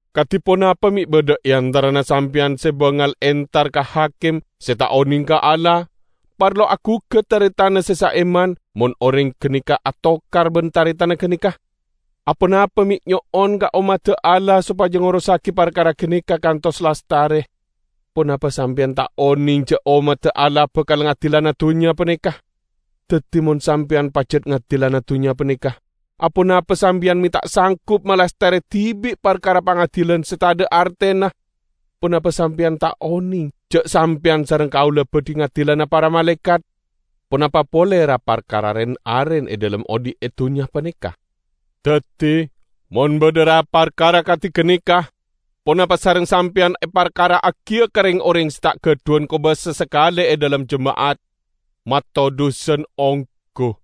Kadi ponapa me' badha e antarana sampeyan se bangal entar ka hakim se ta' oneng ka Allah, parlo agugat taretanna se saiman mon oreng ganeka atokar ban taretanna ganeka? Ponapa me' nyo'on ka ommadda Allah sopaja ngorossagi parkara ganeka kantos lastare? Ponapa sampeyan ta' oneng ja' ommadda Allah bakal ngadilana dunnya paneka? Daddi, mon sampeyan pajat ngadilana dunnya paneka, aponapa sampeyan me' ta' sanggup malastare dibi' parkara pangadilan se tadha' artena? Ponapa sampeyan ta' oneng ja' sampeyan sareng kaula badhi ngadilana para malaekat? Ponapa pole ra-parkara ren-aren e dhalem odhi' e dunnya paneka! Daddi mon badha ra-parkara kadi ganeka, ponapa sareng sampeyan eparkara'agiya ka reng-oreng se ta' gadhuwan kobasa sakale e dhalem jema'at? Matodhusan onggu!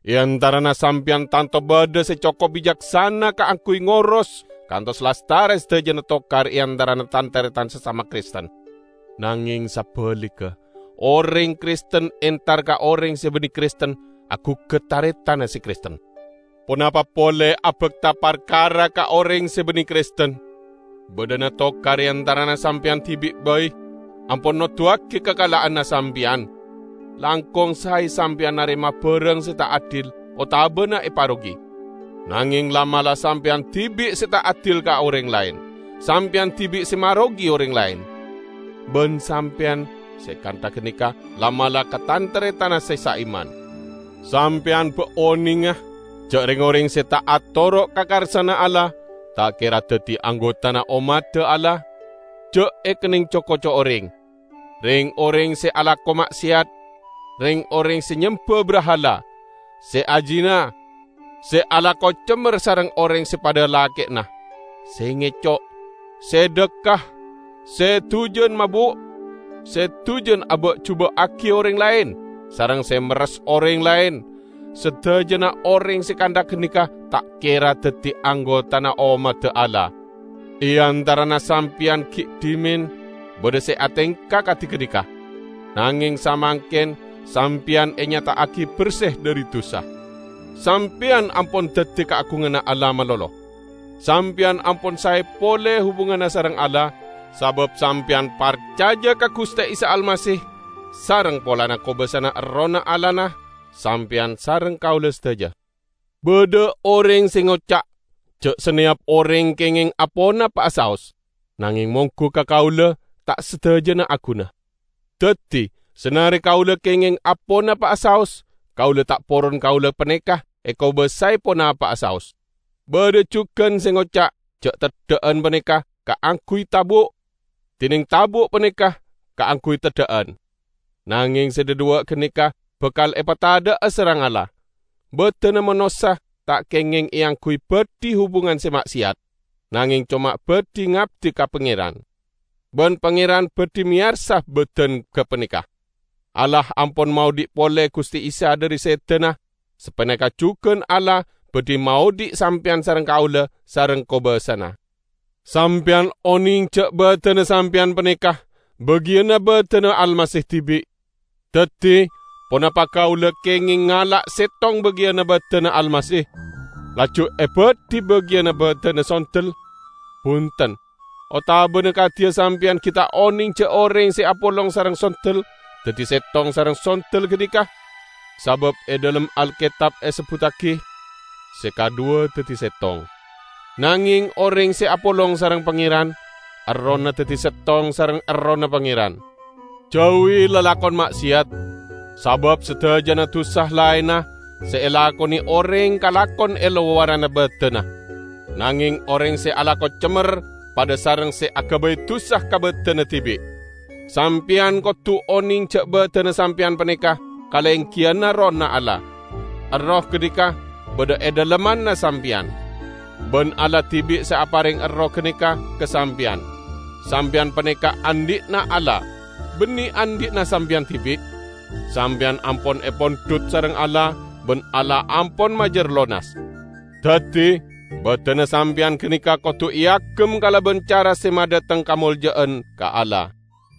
E antarana sampeyan tanto badha se cokop bicaksana kaangguy ngoros kantos lastare sadajana tokar e antarana tan-taretan sasama Kristen! Nangeng sabaligga, oreng Kristen entar ka oreng se banne Kristen agugat taretanna se Kristen! Ponapa pole abakta parkara ka oreng se banne Kristen; badhana tokar e antarana sampeyan dibi' bai ampon noduwagi kakala'anna sampeyan. Langkong sae sampeyan narema barang se ta' adil otabana eparogi! Nangeng la'-mala' sampeyan dibi' se ta' adil ka oreng laen, sampeyan dibi' se marogi oreng laen. Ban sampeyan se kantha ganeka la'-mala' ka tan-taretanna se saiman. Sampeyan ba' onenga ja' reng-oreng se ta' atoro' ka karsana Allah, ta' kera daddi anggotana ommadda Allah? Ja' ekenneng co-koco oreng! Reng-oreng se alako ma'seyat, reng-oreng se nyemba brahala, se azina, se alako cemmer sareng oreng se padha lake'na, se ngeco', se dhakka, se dujan mabu', se dujan aba'-juba'agi oreng laen, sareng se merres oreng laen -- sadajana oreng se kantha ganeka ta' kera daddi anggotana ommadda Allah. E antarana sampeyan gi' dhimen badha se atengka kadi ganeka. Nangeng samangken sampeyan enyata'agi berse dhari dusa. Sampeyan ampon daddi kaagunganna Allah malolo. Sampeyan ampon sae pole hubunganna sareng Allah, sabab sampeyan parcaja ka Guste Isa Almasih sareng polana kobasana Errohna Allahna sampeyan sareng kaula sadaja. Badha oreng se ngoca' ja' saneyap oreng kengeng aponapa'a saos. Nangeng monggu ka kaula ta' sadajana aguna. Daddi, sanare kaula kengeng aponapa'a saos, kaula ta' poron kaula paneka ekobasae ponapa'a saos. Badha jugan se ngoca' ja' teddha'an paneka kaangguy tabu', dineng tabu' paneka kaangguy teddha'an. Nangeng se dhadhuwa' ganeka bakal epatadha'a sareng Allah. Badanna manossa ta' kengeng eangguy badhi hubungan se ma'seyat, nangeng coma badhi ngabdi ka Pangeran. Ban Pangeran badhi meyara badan gapaneka. Allah ampon maodhi' pole Guste Isa dhari sedana, sapaneka jugan Allah badhi maodhi' sampeyan sareng kaula sareng kobasana. Sampeyan oneng ja' badanna sampeyan paneka bagiyanna badanna Almasih dibi'. Daddi, ponapa kaula kengeng ngala' settong bagiyanna badanna Almasih, laju ebadhi bagiyanna badanna sondel? Bunten! Otabana, kadiya sampeyan gi' ta' oneng ja' oreng se apolong sareng sondel, daddi settong sareng sondel ganeka? Sabab e dhalem Alketab esebbuttagi, "Se kadhuwa daddi settong." Nangeng oreng se apolong sareng Pangeran, errohna daddi settong sareng Errohna Pangeran. Jauwi lalakon ma'seyat. Sabab sadajana dusa laenna se elakone oreng kalakon e lowaranna badanna. Nangeng oreng se alako cemmer, padha sareng se agabay dusa ka badanna dibi'. Sampeyan kodu oneng ja' badanna sampeyan paneka kalenggiyanna Errohna Allah. Erroh ganeka badha e dhalemmanna sampeyan. Ban Allah dibi' se apareng Erroh ganeka ka sampeyan. Sampeyan paneka andhi'na Allah, banne andhi'na sampeyan dibi'. Sampeyan ampon epondhut sareng Allah, ban Allah ampon majar lonas. Daddi, badanna sampeyan ganeka kodu eagem kalaban cara se madhateng kamolja'an ka Allah.